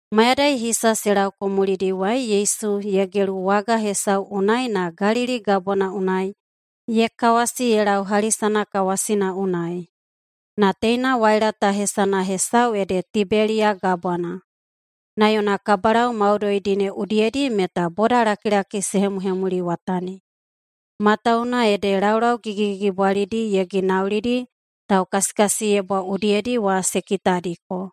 Mayadai hisa se laoko mulidiwai Yesu ye gelu waga hesau unai na Galili Gabwana unai ye kawasi ye lau hali sanakawasina unai. (Na teina waila ta hesana hesau ede Tibeliya Gabwana). Na yona kabalau maudoidi ne udiyedi meta bodalakilaki se hemuhemuliwatani, matawuwuna ede laulau gigigigibwalidi ye ginaulidi taukasikasiyebwa udiyedi wa se kitadiko.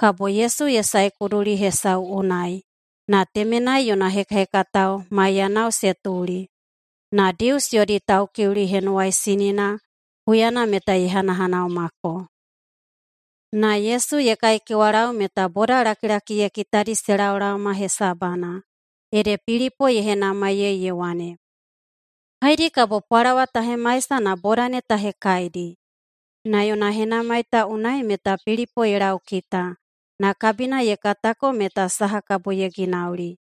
Kabo Yesu ye sae kuduli hesau unai, na temenai yona hekahekatao maiyanao se tuli. Na Dius yodi Taukiuli Henuwaisinina huyana meta ye hanahanaumako. Na Yesu ye kaikewalau meta bodalakilaki ye kitadi se laolaoma hesabana, ede Pilipo ye henamaiyei ye wane, “Haedi kabo pwalawa ta hemaisa na boda ne ta hekaidi?” Na yona henamai ta unai meta bena Pilipo ye laukita, na kabina ye katako meta saha kabo ye ginauli.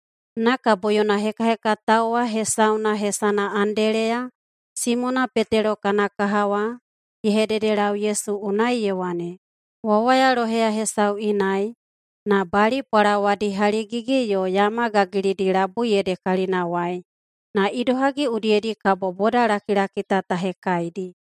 Na kabo yona hekahekatao wa hesauna hesana Andeleya, Simona Petelo kana kaha wa, ye hededelau Yesu unai ye wane, “Wawaya loheya hesau inai, na bali pwalawadi haligigi yo yama gagilidi labui ede kalinawai. Na idohagi udiyedi kabo bodalakilaki ta ta hekaidi?”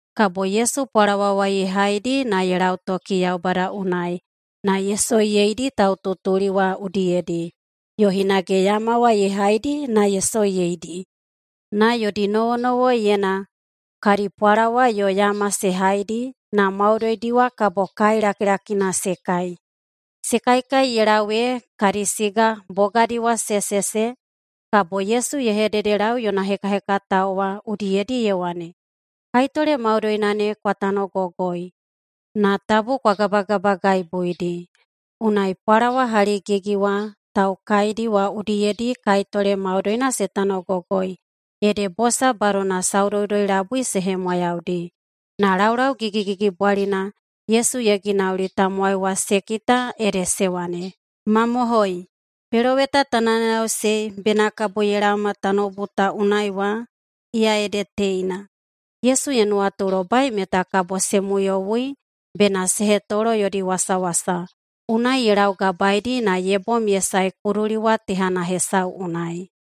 Kabo Yesu pwalawa wa ye haidi na ye lautoki Yaubada unai, na ye soiyeidi taututuli wa udiyedi. Yo hinage yama wa ye haidi na ye soiyeidi. Na yodi nowonowoiyena kadi pwalawa yo yama se haidi, na maudoidi wa kabo kai lakilakina se kai. Se kaikai ye lau ee kadi siga bogadi wa se sese. Kabo Yesu ye hededelau yona hekahekatao wa udiyedi ye wane, “Kaitole maudoina ne kwa tanogogoi, na tabu kwa gabagabagaibuidi.” Unai pwalawa haligigi wa taukaidi wa udiyedi kaitole maudoina se tanogogoi, ede bosa badona saudoudoi-labui se hemwayaudi. Na laulau gigigigibwalina Yesu ye ginauli tamowai wa se kita ede se wane, “Mamohoi, peloweta ta nayanayaꞌusei bena kabo ye laoma tanoubu ta unai wa, iya ede teina.” Yesu ye nuwatulobai meta kabo se muyowui bena se hetolo yodi wasawasa, unai ye laugabaedi na ye bom ye sae kuduli wa tehana hesau unai.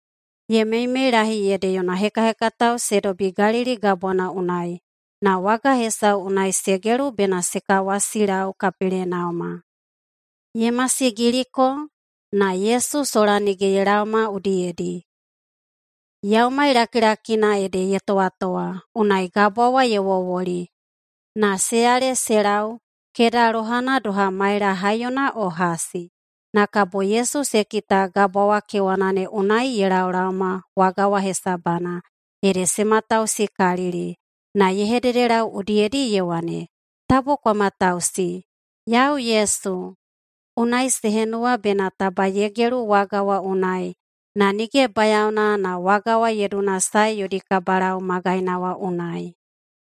Ye meimeilahi ede yona hekahekatao se dobi Galili Gabwana unai, na waga hesau unai se gelu bena se kawasilau Kapelenauma. Ye masigiliko, na Yesu sola nige ye laoma udiyedi. Yaumai lakilakina ede ye towatowa, unai gabwa wa ye wowoli. Na se yale se lau keda lohana doha maela haiyona o hasi, na kabo Yesu se kita Gabwa wa kewana unai ye laolaoma waga wa hesabana. Ede se matausikalili. Na ye hededelau udiyedi ye wane, “Tabu kwa matamatausi. Yau Yesu.” Unai se henuwa bena taba ye gelu waga wa unai, na nige bayaona na waga wa ye dunasae yodi kabalau magaina wa unai.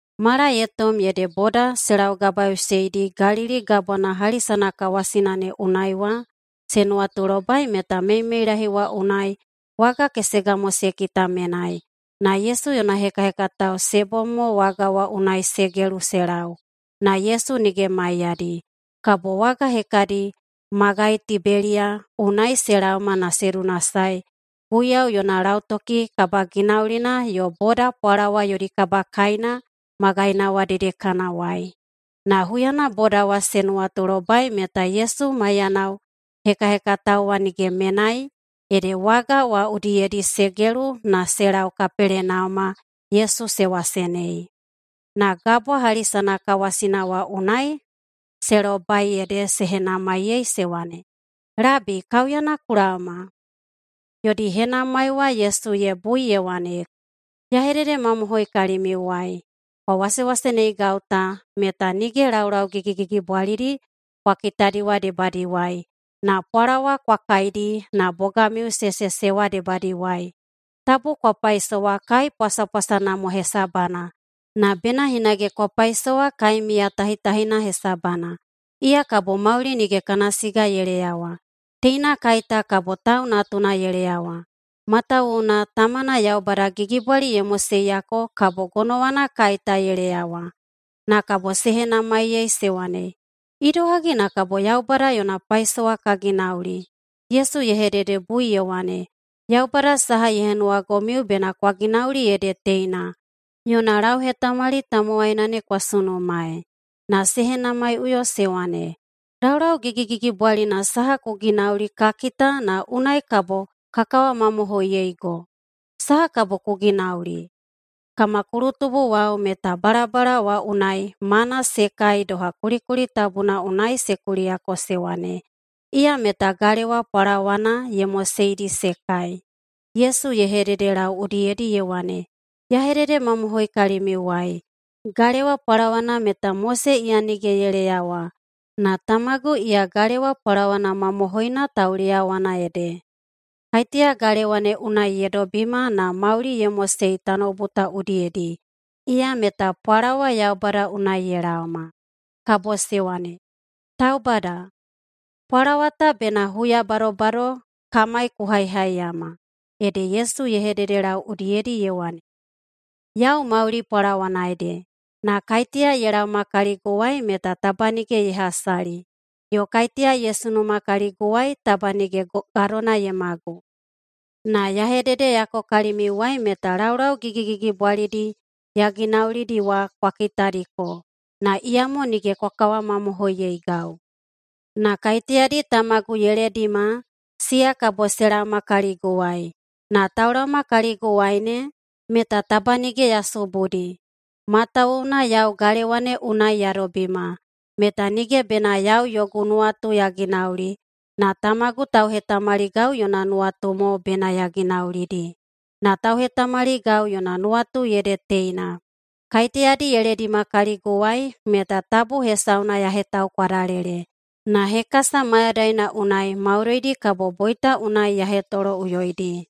Mala ye tom ede boda se laugabaeꞌuseidi Galili Gabwana hali sanakawasina ne unai wa se nuwatulobai meta meimeilahi wa unai waga kesega mo se kita menai, na Yesu yona hekahekatao se bom mo waga wa unai se gelu se lau, na Yesu nige maiyadi. Kabo waga hekadi magai Tibeliya unai se laoma na se dunasae Guiyau yona lautoki kabaginaulina yo boda pwalawa yodi kabakaina magaina wa dedekanawai. Na huyana boda wa se nuwatulobai meta Yesu maiyanao hekahekatao wa nige menai, ede waga wa udiyedi se gelu na se lau Kapelenauma Yesu se wasenei. Na Gabwa hali sanakawasina wa unai se lobai ede se henamaiyei se wane, “Labi, kaiuyana ku laoma?” Yodi henamai wa Yesu ye bui ye wane, “Ya hededemamohoi kalimiuwai: Kwa wasewaseneigau ta meta nige laulau gigigigibwalidi kwa kitadi wa debadiwai, na pwalawa kwa kaidi na bogamiu se sese wa debadiwai. Tabu kwa paisowa kai pwasapwasana mo hesabana, na bena hinage kwa paisowa kai miyatahitahina hesabana. Iya kabo mauli nige kana siga ye leyawa. Teina kai ta kabo Tau Natuna ye leyawa, matawuwuna Tamana Yaubada gigibwali ye moseyako kabo gonowana kai ta ye leyawa.” Na kabo se henamaiyei se wane, “Idohagi na kabo Yaubada yona paisowa ka ginauli?” Yesu ye hededebui ye wane, “Yaubada saha ye henuwagomiu bena kwa ginauli ede teina: Yona lauhetamali tamowaina ne kwa sunumaei.” Na se henamaiꞌuyo se wane, “Laulau gigigigibwalina saha ku ginauli ka kita na unai kabo ka kawamamohoiyeigo? Saha kabo ku ginauli? Kama kulutubuwao meta balabala wa unai ‘mana’ se kai doha kulikuli tabuna unai se kuliyako se wane, ‘Iya meta galewa pwalawana ye moseidi se kai.’” Yesu ye hededelau udiyedi ye wane, “Ya hededemamohoi kalimiuwai: Galewa pwalawana meta Mose iya nige ye leyawa, na Tamagu iya galewa pwalawana mamohoina tauleyawana ede. Kaiteya galewa ne unai ye dobima na mauli ye mosei tanoubu ta udiyedi, iya meta pwalawa Yaubada unai ye laoma.” Kabo se wane, “Taubada, pwalawa ta bena huya badobado kamai ku haihaiyama.” Ede Yesu ye hededelau udiyedi ye wane, “Yau mauli pwalawana ede. Na kaiteya ye laoma kaliguwai meta taba nige ye hasali, yo kaiteya ye sunuma kaliguwai taba nige gadona ye magu. Na ya hededeyako kalimiuwai meta laulau gigigigibwalidi ya ginaulidi wa kwa kitadiko, na iyamo nige kwa kawamamohoiyeigau. Na kaiteyadi tamagu ye ledima, siya kabo se laoma kaliguwai. Na taulaoma kaliguwai ne, meta taba nige ya subudi. Matawuwuna yau galewa ne unai ya dobima, meta nige bena yau yogu nuwatu ya ginauli, na Tamagu tauhetamaligau yona nuwatu mo bena ya ginaulidi. Na tauhetamaligau yona nuwatu ede teina: Kaiteyadi ye ledima kaliguwai, meta tabu hesauna ya hetaukwadalele, na hekasa mayadaina unai maudoidi kabo boita unai ya hetoloꞌuyoidi.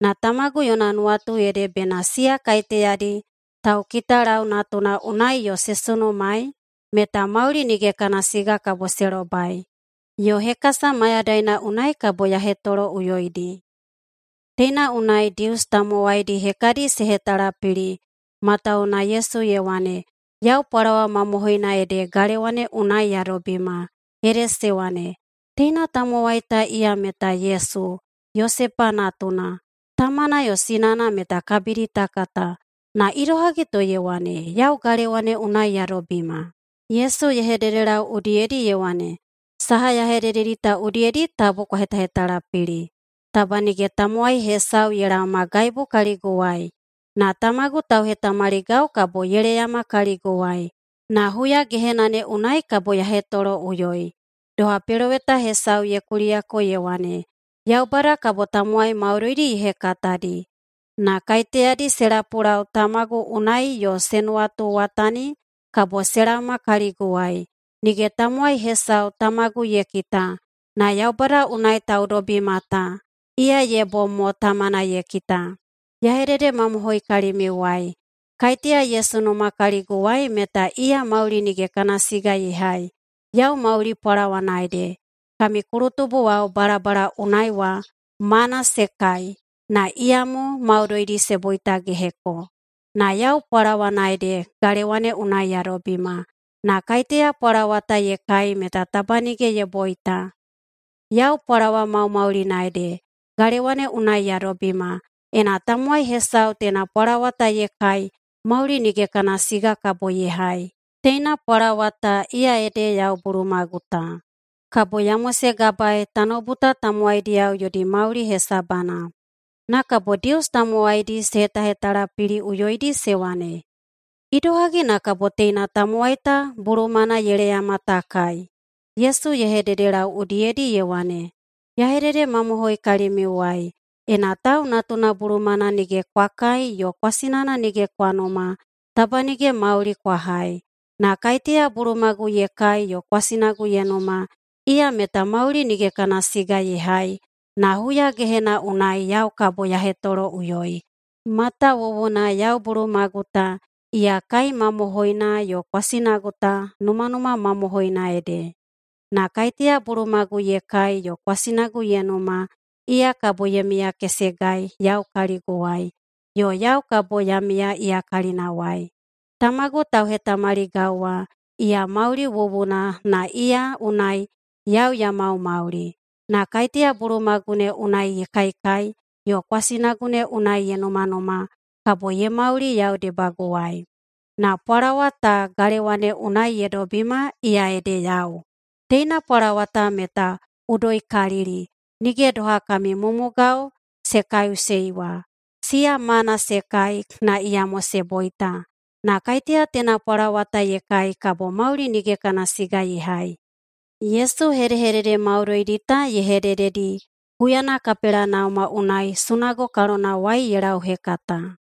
Na Tamagu yona nuwatu ede bena siya kaiteyadi taukitalau Natuna unai yo se sunumaei, meta mauli nige kana siga kabo se lobai, yo hekasa mayadaina unai kabo ya hetoloꞌuyoidi.” Teina unai Dius tamowaidi hekadi se hetalapili, matawuwuna Yesu ye wane, “Yau pwalawa mamohoina ede galewa ne unai ya dobima.” Ede se wane, “Teina tamowai ta, iya meta Yesu, Yosepa natuna, tamana yo sinana meta kabidi ta kata. Na idohagi to ye wane, ‘Yau galewa ne unai ya dobima’?” Yesu ye hededelau udiyedi ye wane, “Saha ya hedededi ta udiyedi tabu kwa hetahetalapili. Taba nige tamowai hesau ye laomagaibu kaliguwai, na Tamagu tauhetamaligau kabo ye laeyama kaliguwai, na huyagehena ne unai kabo ya hetoloꞌuyoi. Doha peloweta hesau ye kuliyako ye wane, ‘Yaubada kabo tamowai maudoidi ye hekatadi.’ Na kaiteyadi se lapulau Tamagu unai yo se nuwatuwatani, kabo se laoma kaliguwai. Nige tamowai hesau Tamagu ye kita, na Yaubada unai taudobima ta, iya ye bom mo Tamana ye kita. Ya hededemamohoi kalimiuwai: Kaiteya ye sunuma kaliguwai meta iya mauli nige kana siga ye hai. Yau mauli pwalawana ede. Kami kulutubuwao balabala unai wa mana se kai, na iyamo maudoidi se boitageheko. Na yau pwalawana ede galewa ne unai ya dobima, na kaiteya pwalawa ta ye kai meta taba nige ye boita. Yau pwalawa maumaulina ede, galewa ne unai ya dobima. Ena tamowai hesau teina pwalawa ta ye kai, mauli nige kana siga kabo ye hai. Teina pwalawa ta iya ede yau bulumagu ta, kabo ya mosegabaei tanoubu ta tamowaidiyao yodi mauli hesabana.” Na kabo Dius tamowaidi se hetahetalapiliꞌuyoidi se wane, “Idohagi na kabo teina tamowai ta bulumana ye leyama ta kai?” Yesu ye hededelau udiyedi ye wane, “Ya hededemamohoi kalimiuwai: Ena Tau Natuna bulumana nige kwa kai yo kwasinana nige kwa numa, taba nige mauli kwa hai. Na kaiteya bulumagu ye kai yo kwasinagu ye numa, iya meta mauli nige kana siga ye hai na huya gehena unai yau kabo ya hetoloꞌuyoi. Matawuwuna yau bulumagu ta, iya kai mamohoina yo kwasinagu ta numanuma mamohoina ede. Na kaiteya bulumagu ye kai yo kwasinagu ye numa, iya kabo ye miyakesegai yau kaliguwai, yo yau kabo ya miya iya kalinawai. Tamagu tauhetamaligau wa, iya mauli wuwuna na iya unai yau ya maumauli, na kaiteya bulumagu ne unai ye kaikai yo kwasinagu ne unai ye numanuma, kabo ye mauli yau debaguwai. Na pwalawa ta galewa ne unai ye dobima iya ede yau. Teina pwalawa ta meta udoikalili, nige doha kami mumugao se kaiꞌusei wa. Siya mana se kai, na iyamo se boita. Na kaiteya teina pwalawa ta ye kai kabo mauli nige kana siga ye hai.” Yesu hedehedede maudoidi ta ye hedededi huyana Kapelenauma unai sunago kalonawai ye lauhekata.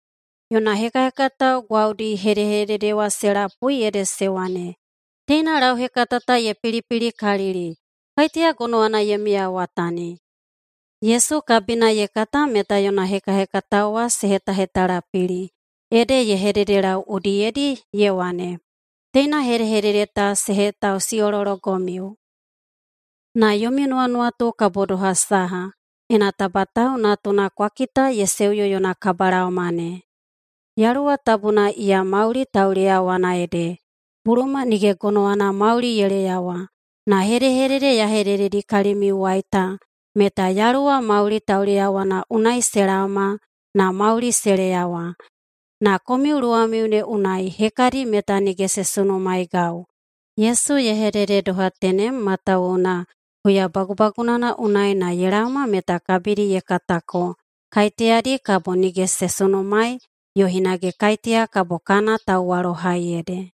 Yona hekahekatao gwaudi hedehedede wa se lapui ede se wane, “Teina lauhekata ta ye pilipilikalili. Kaiteya gonowana ye miyawatani?” Yesu kabina ye kata meta yona hekahekatao wa se hetahetalapili, ede ye hededelau udiyedi ye wane, “Teina hedehedede ta se hetausiꞌolologomiu? Na yomi nuwanuwatu kabo doha saha, ena taba Tau Natuna kwa kita ye seuyo yona kabalaoma ne? Yaluwa Tabuna iya mauli tauleyawana ede, buluma nige gonowana mauli ye leyawa. Na hedehedede ya hedededi kalimiuwai ta, meta Yaluwa mauli tauleyawana unai se laoma na mauli se leyawa. Na komiu luwamiu ne unai hekadi meta nige se sunumaeigau.” Yesu ye hedede doha tenem matawuwuna huya bagubagunana unai na ye laoma meta kabidi ye katako kaiteyadi kabo nige se sunumaei yo hinage kaiteya kabo kana tauwalohai ede.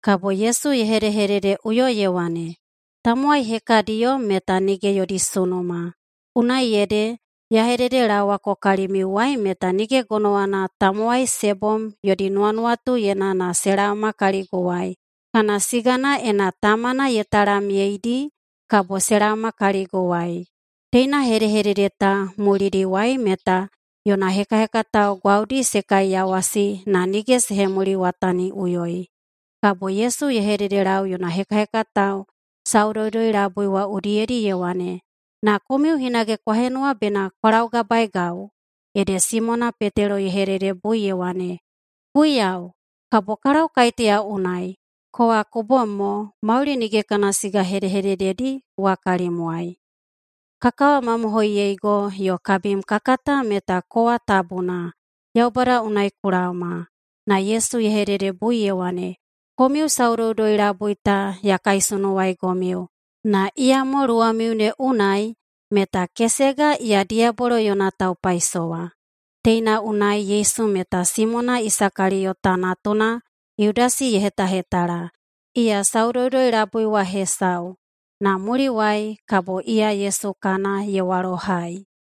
Kabo Yesu ye hedehededeꞌuyo ye wane, “Tamowai hekadiyo meta nige yodi sunuma, unai ede ya hededelaowako kalimiuwai meta nige gonowana tamowai se bom yodi nuwanuwatuyena na se laoma kaliguwai, kana sigana ena Tamana ye talamyeidi kabo se laoma kaliguwai.” Teina hedehedede ta mulidiwai meta yona hekahekatao gwaudi se kaiyawasi na nige se hemuliwataniꞌuyoi. Kabo Yesu ye hededelau yona hekahekatao saudoudoi-labui wa udiyedi ye wane, “Na komiu hinage kwa henuwa bena kwa laugabaegau?” Ede Simona Petelo ye hededebui ye wane, “Guiyau, kabo ka lau kaiteya unai? Kowa ku bom mo mauli nige kana siga hedehedededi wa kalimwai. Ka kawamamohoiyeigo yo kabim ka kata meta kowa Tabuna, Yaubada unai ku laoma.” Na Yesu ye hededebui ye wane, “Komiu saudoudoi-labui ta ya kaisunuwaigomiu, na iyamo luwamiu ne unai meta kesega iya diyabolo yona taupaisowa.” Teina unai Yesu meta Simona Isakaliyota natuna Yudasi ye hetahetala. Iya saudoudoi-labui wa hesau, na muliwai kabo iya Yesu kana ye walohai.